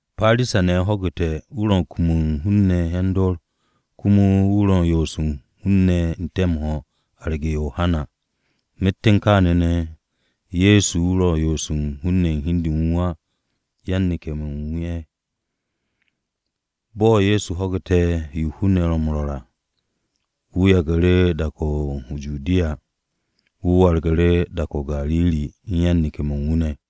Parisa-ne̱ ho̱gu̱te̱ wu̱ ro̱ m-kum u̱n hun-ne̱ yan-dor komo wu̱ ro̱ m-yo'os u̱n hun-ne̱ n-te̱ m-ho̱, arge̱ Yohana. (Myet u̱n kaane̱ ne̱, Ye̱so wu̱ yo'os ye̱ m-ho̱ u̱n hi u̱n de u̱n wu̱ á, yan-neke̱-mo̱ u̱n wu̱ ne̱ ye̱). Bo̱ Ye̱so ho̱gu̱te̱ yo hun-ne̱ ro̱ m-rwo̱r à, wu̱ yagu̱ru̱ dak-o̱ o-Judiya, wu̱ wargu̱ru̱ dak-o̱ o-Gariri u̱n yan-neke̱-mo̱ u̱n wu̱ ne̱.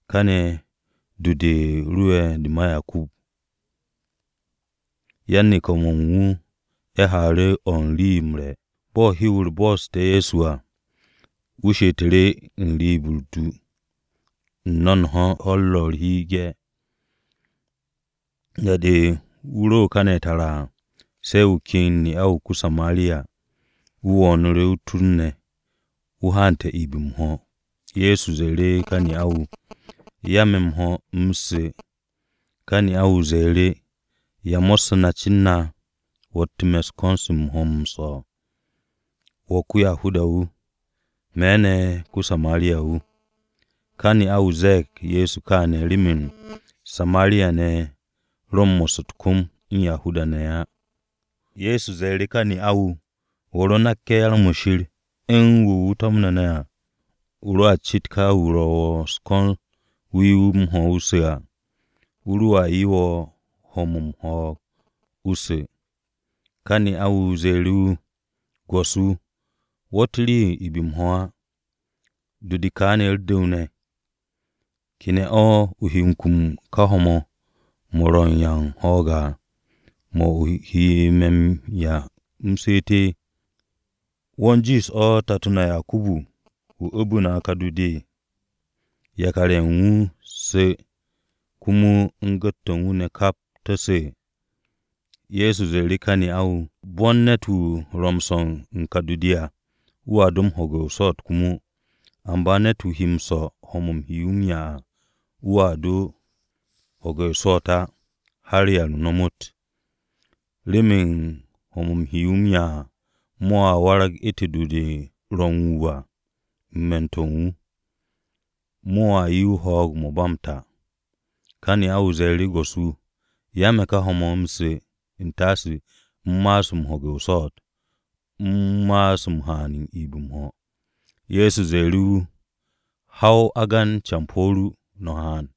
káne̱ du-u̱r rowe̱ de ma Yakubu. Yan-neke̱-mo̱ u̱n wu̱ ne̱ haaru̱ o̱ u̱n rii-yo m-re̱ o-bo̱. Bo̱ hew-u̱r bo'oste̱ Ye̱so à, wu̱ she'etu̱ru̱ n-riib u̱r-du, n-no̱o̱nho̱, ho̱-u̱r ro u̱r-hi ge̱. Da-de wu̱ ro kane̱ tara à, se̱ wu̱ ken ne'a-wu̱ ko-Samariya, wu̱ wo̱o̱nu̱ru̱ o-tur ne̱. Wu̱ haante̱ iib m-ho̱. Ye̱so ze̱e̱ru̱ ka ne'a-wu̱, “Ya me̱ m-ho̱ u̱m su̱.” Ká ne'a-wu̱ ze̱e̱ru̱, “¿Ya mo̱ssu̱ na cen na, wo̱tte̱ me̱ u̱n ko̱n-se u̱n ho̱-mo̱ m-swo̱? Wo̱ ko-Yahuda-wu̱, me̱ ne̱ ko-Samariya-wu̱.” (Ka ne'a-wu̱ ze̱e̱g Ye̱so kaane̱ remen Samariya-ne̱ ye̱ ro̱ m-mo̱sse̱ u̱t-kom u̱n Yahuda-ne̱ á.) Ye̱so ze̱e̱ru̱ ka ne'a-wu̱, “Wo̱ ro nakke̱ yar-mo̱ Shir, u̱n wu̱ wu̱ to̱mne̱ ne̱ à, o roa cit ka wu̱ ro̱ wo̱ u̱s-ko̱n o 'ye wu̱ m-ho̱ wu̱ su̱ à, wu̱ roa 'ye wo̱ ne̱ ho̱-mo̱ u̱n ho̱o̱g o su̱.” Ka ne'a-wu̱ ze̱e̱ru̱ wu̱, “Go̱s-wu̱, wo̱tt rii-o̱ m-iib m-ho̱ á, du-de ka ne̱ u̱r-du̱w ne̱. ¿Ke ne̱ o̱ o he kum u̱n ká ho̱-mo̱ mo̱ ro̱ u̱n ya'u̱ u̱n ho̱o̱g à, mo̱ o he me̱ m-'ya u̱m su̱u̱t? ¿Wo̱ u̱n jiish o̱ tato na Yakubu, wu̱ u̱bu̱ na ka du-de, yakar-ye̱ u̱n wu̱ su̱, komo u̱n gu̱t-to̱ u̱n wu̱ ne̱ kap to̱ su̱?” Ye̱so ze̱e̱ru̱ ka ne'a-wu̱, “Bo̱n ne̱t-wu̱ ro̱ m-swo̱ u̱n ka du-de à, wu̱a do m-ho̱ge̱ o-swo̱o̱t komo. Amba ne̱t-wu̱ he m-swo̱ ho̱-mo̱ u̱m he wu̱ m-'ya à, wu̱a do m-ho̱ge̱ o-swo̱o̱t á, har da-o̱ ba m-ta. Remen ho̱-mo̱ u̱m he wu̱ m-'ya à, mo̱a warag u̱ntu̱n yish-to̱ m-ho̱ u̱n me̱n-to̱ u̱n wu̱. Mo̱a 'ye wu̱ ho̱o̱g-mo̱ ba m-ta.” Ka ne'a-wu̱ ze̱e̱ru̱, “Go̱s-wu̱, 'ya me̱ ka ho̱-mo̱ u̱m su̱ u̱n taase u̱m ma'as m-ho̱ge̱ o-swo̱o̱t, u̱m ma'as m-haan iib m-ho̱.” Ye̱so ze̱e̱ru̱ wu̱, “Ha o agan campo̱ ru, no̱ haan.”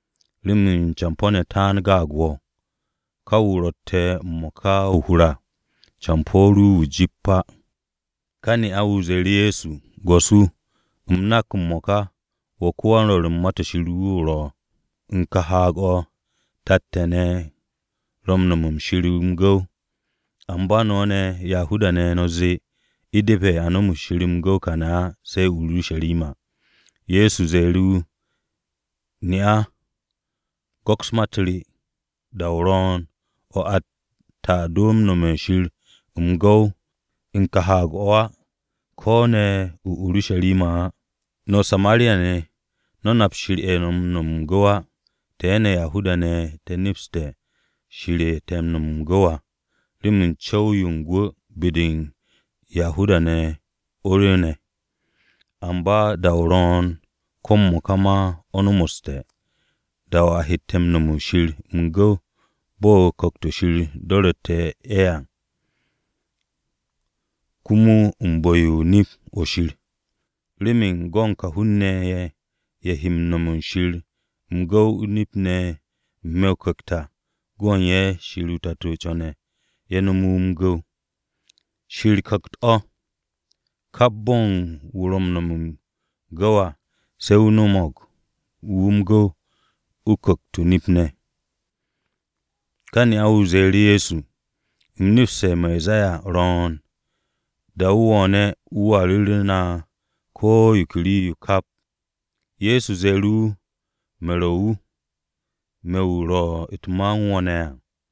remen campo̱-ne̱ taan gaag wo̱, ka wu̱ o ro̱tte̱ ne̱ m-mo̱ka o-hur à campo̱ ru wu̱ o-jip wu̱ á.” Ka ne'a-wu̱ ze̱e̱ru̱ Ye̱so, “Go̱s-wu̱, u̱m nak m-mo̱ka wo̱ ko-wan-rwo̱r u̱n Ma-to̱ Shir o ro̱. U̱n ka haag-o̱, tat-ne̱ te̱ ne̱ ro m-nome̱ Shir m-gu̱w. Amba no̱ ne̱, Yahuda-ne̱ no̱ zee, u̱depe̱ a nome̱ Shir m-gu̱w kàne̱ á, se̱ o-Urusharima.” Ye̱so ze̱e̱ru̱ wu̱, “Ne'a, go̱ks ma-u̱t re, da-o ro̱o̱n, o̱ atte̱ a do nome̱ u̱n Shir m-gu̱w u̱n ka haag-o̱ á, ko̱ ne̱ o-Urusharima á. No̱ Samariya-ne̱, no̱ nap Shir ye̱ no̱ m-nome̱ m-gu̱w á. Te̱ ne̱, Yahuda-ne̱ te̱ nepste̱ Shir ye̱ te̱ m-nome̱ m-gu̱w à, remen co̱w-yo u̱n gwu̱ be-de u̱n Yahuda-ne̱ o̱ yo rwu̱u̱ne̱. Amba da-o ro̱o̱n, ko̱ m-mo̱ka ma o̱ nomoste̱, da-o̱ a hette̱ nome̱ u̱n Shir m-gu̱w bo̱ Ku̱kt-o̱ Shir do̱ru̱tte̱ à, komo u̱n bu̱-yo u̱n nip-o̱ Shir. Remen go̱n ka hun-ne̱ ye̱, ye̱ he nome̱ u̱n Shir m-gu̱w o-nip ne̱ n-me̱ o-Ku̱kt à, go̱n u̱n ye̱ Shir o-Tato co̱ne̱ ye̱ nome̱ wu̱ m-gu̱w. Shir Ku̱kt-o̱. Kap bo̱ u̱n wu̱ ro̱ wu̱ m-nome̱ m-gu̱w à, se̱ wu̱ nomo wu̱ m-gu̱w u̱n ku̱kt-o̱ o-nip ne̱.” Ka ne'a-wu̱ ze̱e̱ru̱ Ye̱so, “U̱m nepste̱ Mesaya ro̱o̱n, da-o̱ wu̱ wo̱o̱ne̱, wu̱a ru̱ru̱ na ko̱ yo ke rii-yo kap.” Ye̱so ze̱e̱ru̱ wu̱, “Me̱ ro̱ wu̱, me̱ wu̱ ro̱ u̱t-ma u̱n wo̱ ne̱ à.”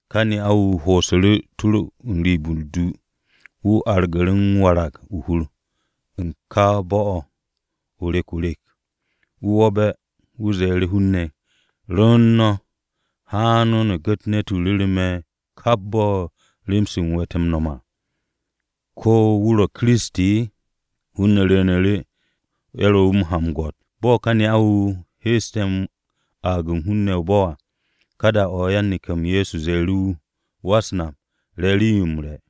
Ka ne'a-wu̱ ho'osu̱ru̱ o-tur n-riib u̱r-du. Wu̱ argu̱ru̱ m-warag o-hur u̱n ka bo̱-o̱ o-rek o-rek. Wu̱ wo̱be̱, wu̱ ze̱e̱ru̱ hun-ne̱, “Rwu̱u̱n no̱, haan no̱ gu̱t ne̱t-wu̱ ru̱ru̱ me̱ kap bo̱ u̱n rem-se u̱m we̱te̱ m-no̱m à! ¿Ko̱ wu̱ ro̱ Kiristi?” Hun-ne̱ rwu̱u̱nu̱ru̱, ye̱ ro̱ wu̱ u̱n ha m-gwo̱t. Bo̱ ka ne'a-wu̱ heeste̱ aag u̱n hun-ne̱ o-bo̱ à, ka da-o̱ yan-neke̱-m Ye̱so ye̱ ze̱e̱ru̱ wu̱, “Wa-u̱s-Nap, re̱ rii-yo m-re̱.”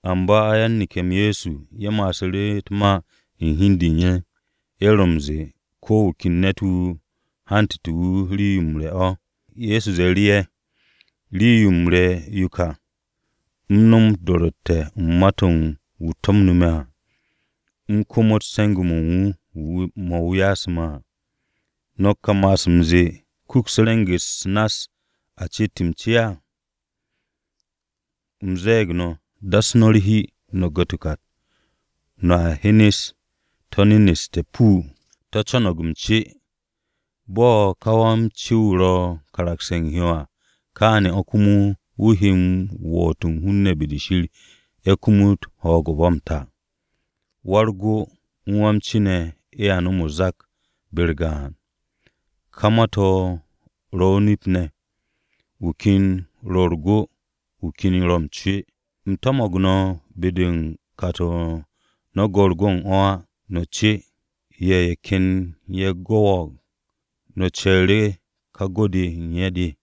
Amba yan-neke̱-m Ye̱so ye̱ ma'asu̱ru̱ u̱t-ma u̱n hi u̱n de u̱n ye̱. Ye̱ ro̱ m-ze̱e̱, “¿Ko̱ wu̱ ken ne̱t-wu̱ u̱n hante̱ wu̱ rii-yo m-re̱ o̱?” Ye̱so ze̱e̱ru̱ ye̱, “Rii-yo m-re̱ re yo ka, u̱m nom o-do̱ro̱tte̱ u̱n ma-to̱ u̱n wu̱ to̱mnu̱ me̱ à, u̱m komot se̱nge̱-mo̱ wu̱ yasu̱ me̱ à. ¿No̱ ka m-ma'as m-ze̱e̱ ‘Kuks re̱ng-u̱s nass a ceet m-ce’? U̱m ze̱e̱g no̱, das no̱ u̱t-hi, no̱ gu̱t u̱t-kat, no̱a hyen to̱ neneste̱. To̱ co̱no̱g m-ce. Bo̱ ko-wa-m-ce ro̱ m-karagse̱ u̱n hyo à, káane̱ o̱ komo wu̱ he woot u̱n hun-ne̱ be-de Shir ye̱ kumut ho̱o̱g-o̱ ba m-ta. Wa-u̱r-go u̱n wa-m-ce ne̱ ye̱a nom o-zak be-u̱r gaan. Ka ma-to̱ ro̱ o-nip ne̱, wu̱ ken ro̱ u̱r-go, wu̱ ken ro̱ m-ce. U̱m to̱mo̱g no̱ be-de u̱n kat-o̱ no̱ go̱ u̱r-go u̱n o̱ á, no̱ ce. Ye̱ ken ye̱ gwo̱wo̱g, no̱ ce̱e̱ru̱ ka go-de u̱n ye̱ de.”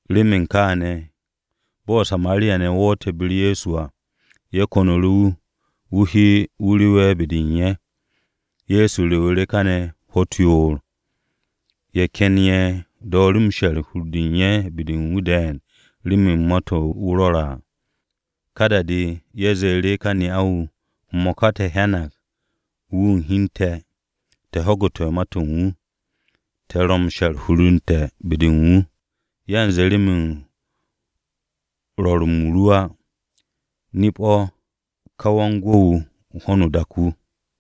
Remen kááne̱ bo̱ Samariya-ne̱ wo̱o̱nte̱ be-u̱r Ye̱so à, ye̱ ko̱nu̱ru̱ wu̱, wu̱ he wu̱ rewe̱ be-de u̱n ye̱. Ye̱so rewu̱ru̱ káne̱ ho̱-u̱t yoor. Ye̱ ken ye̱ dooru̱ she̱r u̱n hur-de u̱n ye̱ be-de u̱n wu̱ de̱e̱n remen ma-to̱ wu̱ rwo̱re̱ à. Ka da-de ye̱ ze̱e̱ru̱ ka ne'a-wu̱, “M-mo̱ka te̱ hyanag wu̱ u̱n hi u̱n te̱, te̱ ho̱gu̱te̱ ma-to̱ u̱n wu̱. Te̱ ro̱ m-she̱r hur u̱n te̱ be-de u̱n wu̱, yanze remen rwo̱r-m ru á. Nip-o̱, wu̱ ka Wan-Gwu̱-o̱ u̱n ho̱no o-dak wu̱!”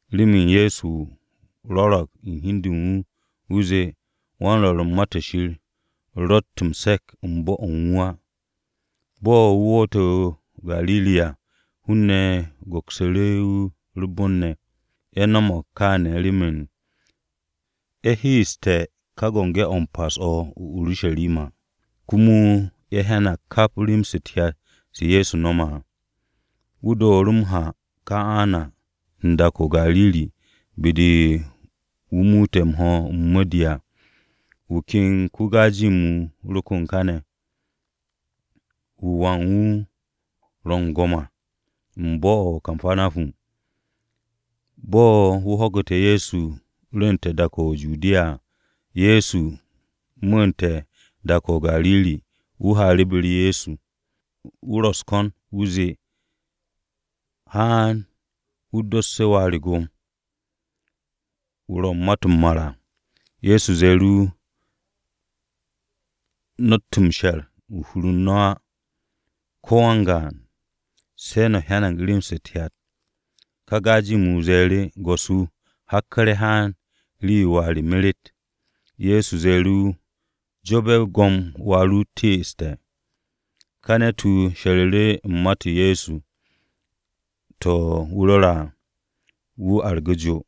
(Remen Ye̱so rwo̱ro̱g u̱n hi u̱n de u̱n wu̱, wu̱ zee, “Wan-rwo̱r u̱n Ma-to̱ Shir, ro̱tt m-se̱k u̱n bo̱-o̱ u̱n wu̱ á.”) Bo̱ wu̱ woote̱ o-Gariri à, hun-ne̱ go̱ksu̱ru̱ wu̱ u̱r-bon ne̱. Ye̱ no̱mo̱g kaane̱ remen ye̱ heeste̱ ka Biki-o̱ m-Pas o̱ o-Urusharima, komo ye̱ hyanag kap rem-se u̱t-hyat se Ye̱so no̱me̱ à. Wu̱ dooru̱ m-ha o-Kana u̱n dak-o̱ o-Gariri be-de wu̱ muute̱ m-ho̱, m-mo̱di à. Wu̱ ken ko-Gajem wu̱ ro kon káne̱ wu̱ wà u̱n wu̱ ro u̱n go̱m à u̱n bo̱-o̱ o-Kapanahum. Bo̱ wu̱ ho̱gu̱te̱ Ye̱so rwu̱u̱nte̱ dak-o̱ o-Judiya à, Ye̱so mu̱u̱nte̱ dak-o̱ o-Gariri, wu̱ haaru̱ be-u̱r Ye̱so. Wu̱ ro wu̱ u̱s-ko̱n u̱nze wu̱ haan wu̱ dosse̱ wà u̱n wu̱ go̱m, wu̱ ro u̱n ma-to̱ m-mar à. Ye̱so ze̱e̱ru̱ wu̱, “No̱tt m-she̱r u̱n hur-u̱r no̱ á ko̱ wan-gaan, se̱ no̱ hyanag rem-se u̱t-hyat.” Ka Gajem-wu̱ ze̱e̱ru̱, “Go̱s-wu̱, hakku̱re̱ haan rii-yo wà re meret.” Ye̱so ze̱e̱ru̱ wu̱, “Jo'obe̱, go̱m wà ru teeste̱.” Ka ne̱t-wu̱ she̱ru̱ru̱ u̱n ma-u̱t Ye̱so ne̱ to̱ wu̱ rwo̱re̱ à, wu̱ argu̱ru̱ jo.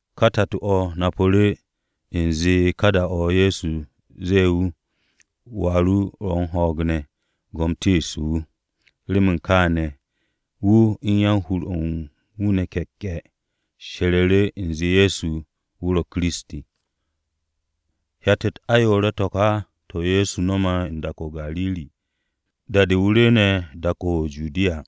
Ka tato-o̱ napu̱ru̱ u̱nze u̱n ka da-o̱ Ye̱so ze̱e̱ wu̱, “Wà ru ro̱ u̱n ho̱o̱g ne̱. Go̱m teeste̱ wu̱.” Remen kááne̱, wu̱ u̱n yan-hur-o̱ u̱n wu̱ ne̱ ke̱'ke̱ she̱ru̱ru̱ u̱nze Ye̱so wu̱ ro̱ Kiristi. Hyat-u̱t ayoore̱-to̱ ka to̱ Ye̱so no̱me̱ u̱n dak-o̱ o-Gariri, da-de wu̱ rwu̱u̱ne̱ dak-o̱ o-Judiya.